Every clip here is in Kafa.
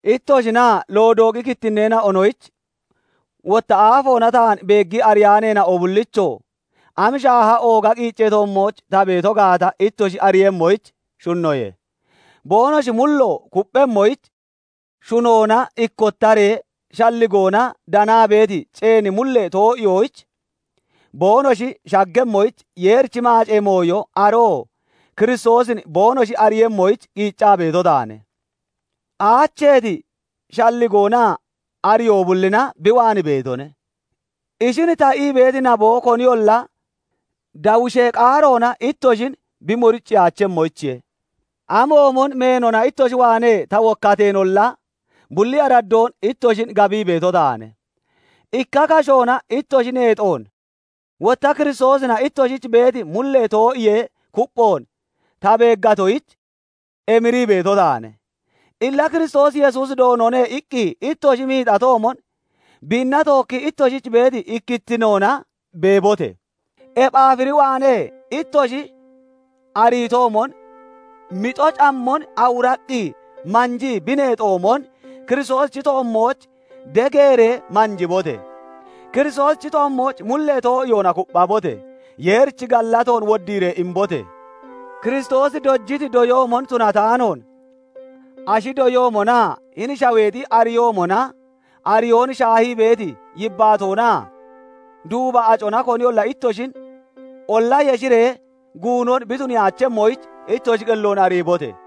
Ittoshinaa Lodooqi kittinneena'onoyich, wotta aafoona taan beeggii ariyaaneena'o bullichoo am shaaha ooga qiiccee toommooch ta beeto gaata ittoshi ariiyemmoyich shunnoye. Boonoshi mullo kupphemmoyich, shunoona ikkottaree shalligoona danaa beeti ceeni mullee too'iyooch boonoshi shaggemmoyich, Yeerichi maacee mooyo, aroo Kiristoosin boonoshi ariiyemmoyich qiiccaa beeto taane; aacheeti shalligoonaa ariyoo bullina bi waan beetone. Ishin ta ii beeti naboo koniyolla dawushee qaaroona ittoshin bi muriciyaachemmoyichiye. Amoomon meenona ittoshi waanee ta wokkateenolla, bulli araddoon ittoshin gabii beeto taane; ikka kashoona ittoshi neexoon, wotta Kiristoosina ittoshich beeti mullee too'iyee kupphoon ta beeggatoyich emirii beeto taane. Illa "Kiristoos Yesuusi Doonone" iqqi ittoshi miixatoomon, biinna tookkii ittoshich beeti ikkittinoona beebote! Ephafir waanee ittoshi ariitoomon mixo cammon awuraqqi manjii bi neexoomon Kiristoosichi toommooch degeeree manjibote! Kiristoosichi toommooch mullee too'iyoona kupphabote! Yeerich gallatoon woddiiree imbote! Kiristoosi dojiti doyoomon tunataanoon, ashi doyoomonaa hini shaweexi ariyoomona, ariyoon shaahii beeti yibbaatoonaa duuba acona koniyolla ittoshin olla yeshiree guunon bi tuniyaachemmoyich ittoshi qelloon ariibote!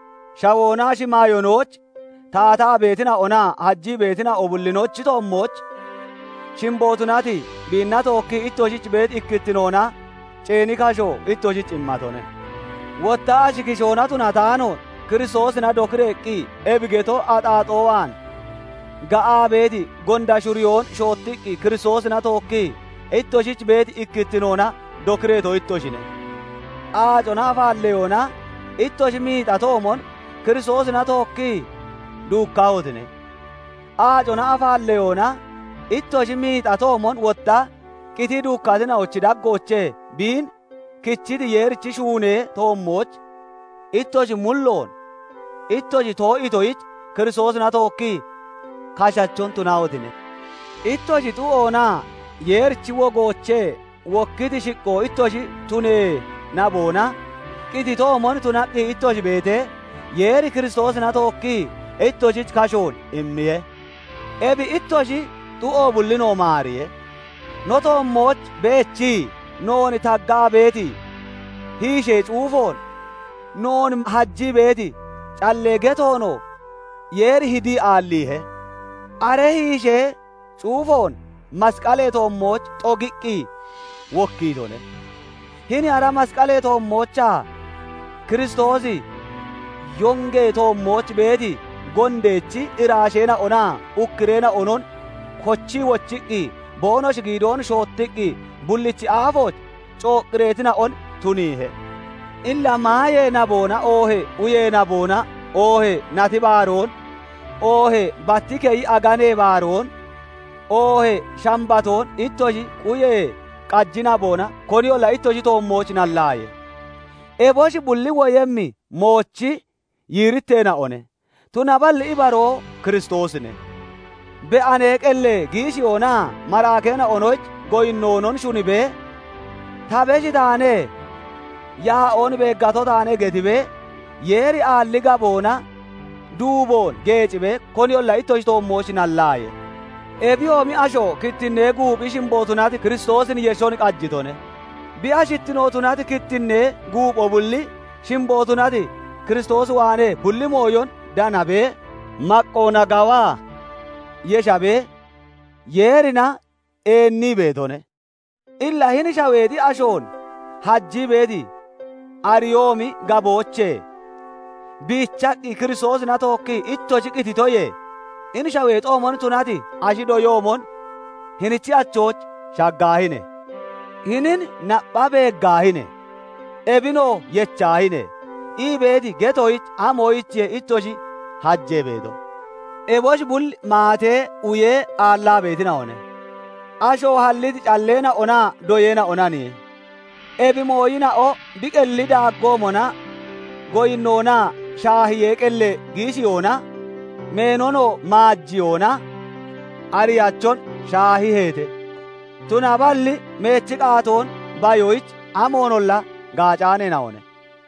Shawoonaa shimaayoonooch taataa beetina'onaa hajii beetina'o bullinochi toommooch shimbo tunati biinna tookkii ittoshich beeti ikkittinoona ceeni kasho ittoshich immatone. Wotta ashi kishoona tunataanoon Kiristoosina dokireeqqi, ebi getoo axaaxoo waan ga'aa beeti gonda shuriyoon shoottiqqi Kiristoosina tookkii ittoshich beeti ikkittinoona dokireeto ittoshine. Aacona afaalleyoona ittoshi miixatoomon Kiristoosina tookkii duukkahotine; aacona afaalleyoona ittoshi miixatoomon wotta qitii duukkatina'ochi daggoochee biin kichiti Yeerichi shuunee toommooch ittoshi mulloon ittoshi too'iitoyich Kiristoosina tookkii kashachon tunahotine. Ittoshi xu'oonaa Yeerichi wogoochee wokkiti shiqqoo ittoshi tunee naboona qititoomon tunaqqi ittoshi beetee, Yeeri Kiristoosina tookkii ittoshich kashoon immiye; ebi ittoshi xu'o bullinoo maariye. No toommooch beechii, noon taggaa beeti hiishee cuufoon, noon hajii beeti callee getoonoo Yeeri hidii aalliihe. Ara hiishee cuufoon masqalee toommooch xogiqqi wokkiitone. Hini ara masqalee toommoochaa Kiristoosi yongee toommooch beeti gondeechi iraasheena'onaa ukkureena'onon kochii wochiqqi, boonoshi giidoon shoottiqqi bullichi aafooch cooqqireetina'on tuniihe. Illa maayee naboona, oohee uyee naboona, oohee nati baaroon, oohee batti keyi aganee baaroon, oohee Shambatoon ittoshi quyee qaji naboona koniyolla ittoshi toommooch nallaaye. Eboshi bulli woyemmi moochi yiiritteena'one; tunaballi ibaroo Kiristoosine. Be'anee qellee giishiyoonaa maraakeena'oyich goyinnoonon shunibee, "Ta beshi taane; yaa'oon beeggato taane" getibee Yeeri aalli gaboona duuboon geecibee koniyolla ittoshi toommooch nallaaye. Ebiyoomi asho kittinnee guuphi shimbo tunati Kiristoosin yeshon qajitone. Bi ashittino tunati kittinnee guupho bulli, shimbo tunati Kiristoos waanee bulli mooyon danaabee, maqqoona gawaa yeshaabee Yeerina eennii beetone. Illa hini shaweexi ashoon hajii beeti ariyoomi gaboochee biichaqqi Kiristoosina tookkii ittoshi qititoyee, hini shaweexoomon tunati ashi doyoomon "Hinichi achooch shaggaahine! Hinin nappha beeggaahine! Ebinoo yechaahine!" ii beeti getoyich amoyichiye ittoshi hajee beeto? Eboshi bulli maatee uyee aallaa beetina'one; asho halliti calleena'onaa doyeena'onaniye. Ebi mooyina'o bi qelli daaggoomona goyinnoonaa shaahiyee qellee giishiyoona, meenonoo maajiyoona ariyachon shaahiiheete; tunaballi meechi qaatoon bayoyich amoonolla gaacaaneena'one.